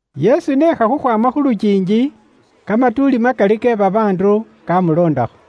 Yesu n'ekha khukhwaama khu lukiingi, kamatuuli makali ke babaandu kamuloondakho.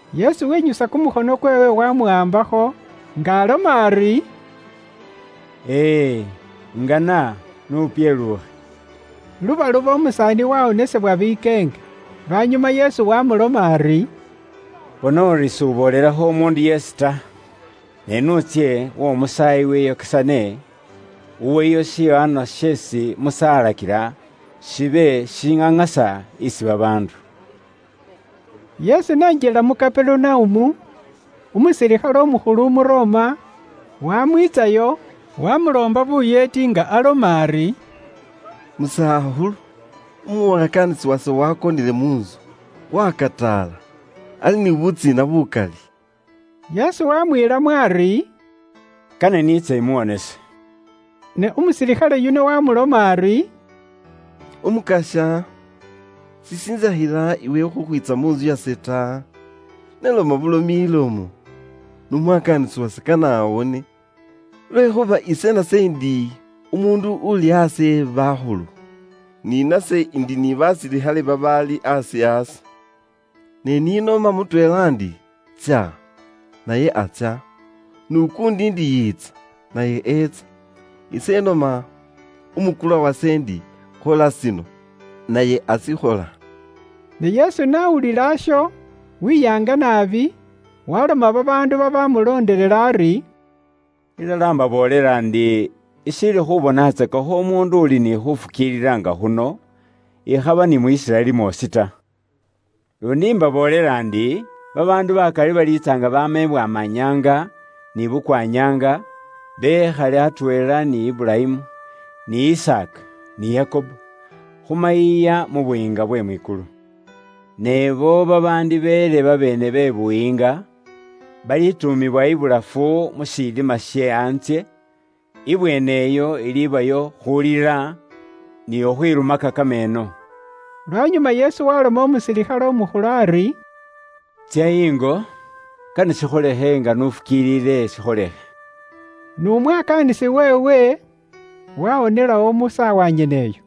Yesu wenyusa kumukhono kweewe wamuwaambakho, nga aloma ari, “Ilala ise ingana; n'upyeluukhe.” Lubaluba umusaani wawonesebwa bikeenge. Lwanyuma Yesu wamuloma ari, “Bona uri s'uboolelakho umuundu yeesi ta, ne n'utsye w'omusaayi wiyokesane, uweyo shiwaanwa sheesi Musa alakila, shibe shishiŋaŋasa isi babaandu.” Yesu n'enjila mu Kaperunaumu, umusilikhale umukhulu Umu Roma waamwiitsayo, waamuloomba buyeeti nga aloma ari, “Musakhulu, umwakaanisi wase waakonele mu ntsu, wakataala, ali ni butsiina bukali.” Yesu waamwiilamo ari, “Kane niitse imuwonese.” Ne umusilikhale yuno waamuloma ari, “Umukasya, sishintsakhila iwe khukhwiitsa mu ntsu yase ta. Ne loma bulomi ilomo, n'umwakaanisi wase kane awone. Lwekhuuba ise nase indi umuundu uuli aasi e bakhulu, ni nase indi ni basilikhale babaali aasi aase. Ne ni noma mutweela ndi, ‘Tsya,’ naye atsya; n'ukuundi ndi, ‘Yiitsa,’ naye eetsa. Ise inoma umukulwa wase ndi, ‘Khola shino,’ naye ashikhola.” Ne Yesu n'awulila isho, weyaanga naabi, waaloma babaandu babaamuloondelela ari, “Ilala imbaboolela ndi, ishiili khubonatsakakho umuundu uli ni khuufukiilila nga khuno, ikhaba ni mu Isiraeli mwoosi ta. Luundi imbaboolela ndi, babaandu bakali baliitsa nga baama ibwamanyaanga ni bukwanyaanga, bekhale atweela ni Iburayimu, ni Isaaka, ni Yakobo, khu mayiiya mu Buyiinga bwe mwikulu. Ne ibo babaandibeele babeene be Buyiinga, balituumibwa ibulafu mu shilima she antsye, ibweeneyo ilibayo khulila ni khukhwilumaka kameeno.” Lwanyuma Yesu waaloma umusilikhale umukhulu ari, “Tsya ingo, sheesi iwe ufukiililamo kane shikholikhe nga iwe n'ufukiilila.” N'umwakaanisi weewe waawonelawo mu saawa nyeneyo.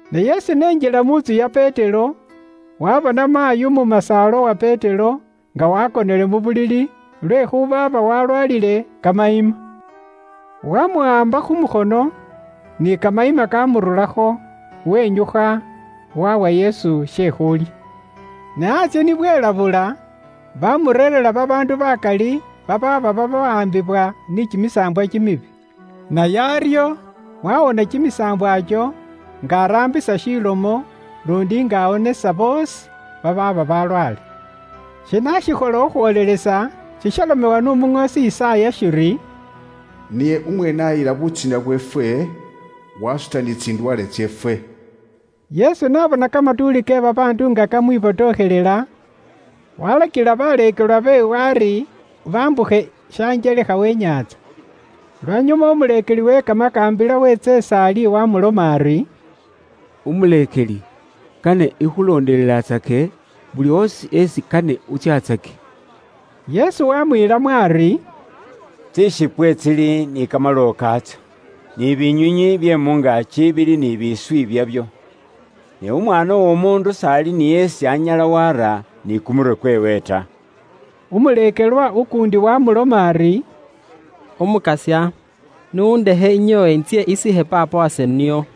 Ne Yesu n'enjila mu ntsu ya Petero, waabona maayi umumasaala uwa Petero nga waakonele mu bulili lwekhuuba aaba walwaalile kamayima. Waamuwaamba khu mukhono, ni kamayima kaamururakho, wenyukha waawa Yesu she khulya. Ne antsye ni bwelabula, baamureerera babaandu bakali babaaba bataambisibwa ni kimisaambwa, naye aryo waawoona kimisaambwa ikyo nga araambisa shilomo, luundi nga awonesa boosi babaaba balwaale. Shino aashikhola khukhwoolelesa shishalomebwa n'umuŋoosi Yisaaya shiri, “Niye umweene aayila butsiina bweefwe, waasuta ni tsindwaale tseefwe.” Yesu n'abona kamatuuli ke babaandu nga kamwibotokhelela, waalakila baleekelwa beewe ari bambukhe shanjelekha we inyaantsa. Lwanyuma umuleekeli we kamakaambila weetsa is'ali waamuloma ari, “Umuleekeli, kane ikhulondelelatsake buli oosi isi kane utsyatsake.” Yesu waamwiilamo ari, “Tsishipwe tsili ni kamalowo kaatso, ni binywiinywi bye mu ngaaki bili ni biiswi byabyo, ne Umwaana w'Omuundu s'ali ni isi anyala waara ni kumurwe kweewe ta.” Umuleekelwa ukuundi waamuloma ari, “Umukasya, n'undekhe inyoowe intsye isiikhe paapa wase nio.”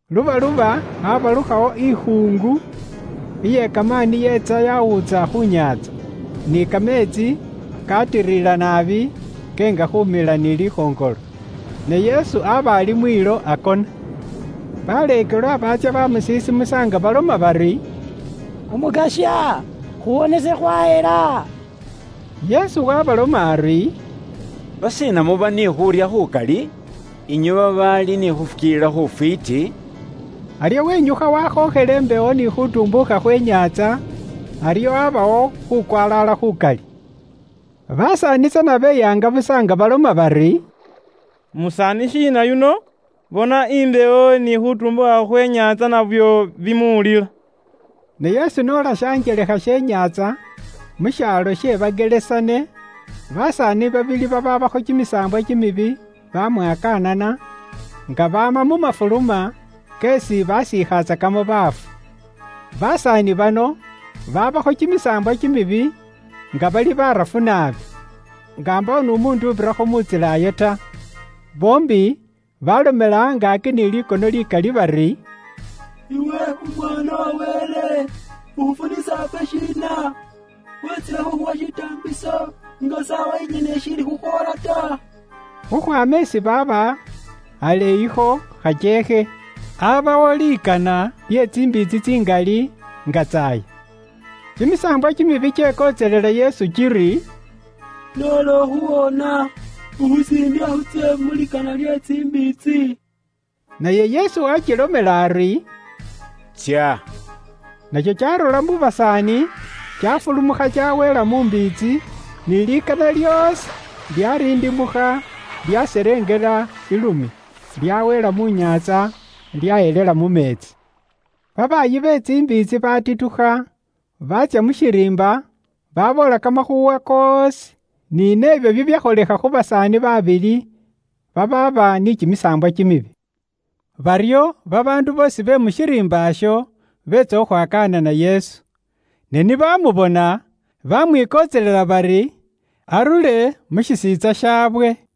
Lubaluba abalukhawo ikhuungu iye kamaani yeetsa yawuutsa khu nyaantsa, ni kameetsi kaatirira naabi keenga khumila ni likhoŋolo. Ne Yesu aba ali mwiilo akona. Baleekelwa baatsya baamusisimusa nga baloma bari, “Umukasya, khuwonese, khwahela!” Yesu waabaloma ari, “Lwashiina muba ni khuurya khukali, inywe babaali ni khuufukiilila khufwiiti?” Aryo wenyukha waakhookhela imbewo ni khuutumbuukha khwe inyaantsa, aryo abawo khuukwalaala khukali. Basaani tsana beyaanga busa nga baloma bari, “Musaani shiina yuno? Bona imbewo ni khuutumbuukha khwe inyaantsa nabyo bimuwulila!” Ne Yesu n'ola shanjelekha she inyaantsa mu shaalo she Bagerasene, basaani babili abe babataambisibwa ni kimisaambwa baamwakaanana, nga baama mu mafuluma keesi basiikhatsakamo baafu. Basaani bano babaabakho kimisaambwa kimibi nga bali barafu naabi, nga mbaawo n'umuundu ubirirakho mu ntsila iyo ta. Boombi baalomela angaaki ni likono likali bari, “Iwe Umwaana wa Wele, ukhufunisa ifwe shiina? Weetsile khuukhuwa shitaambiso nga isaawa inyene ishiili khukhwoola ta?” Khukhwaama isi baaba, aleeyikho khakyeekhe, aabawo likana lye tsimbiitsi tsingali nga tsaaya. Kimimakoombe kyekontselela Yesu kiri, “Noola ukhuwoona, ukhusindikha khutsye mu likana lye tsimbiitsi.” Naye Yesu waakilomela ari, “Tsya!” Nakyo kyaarura mu basaani, kyaafulumukha kyaweela mu mbiitsi, ni likana lyoosi lyaarindimukha, lyaselengela ilumya, lyaweela mu nyaantsa, lyahelela mu meetsi. Babaayi be tsimbiitsi baatitukha, baatsya mu shiriimba, baaboola kamakhuuwa koosi, ni nebyo bibyakholekha khu basaani baabili, babaaba bataambisibwa ni kimisaambwa. Baryo babaandu boosi be mu shiriimba isho beetsa khukhwakaanana Yesu, ne ni bamubona, bamwikontselela bari arure mu shisiintsa shaawe.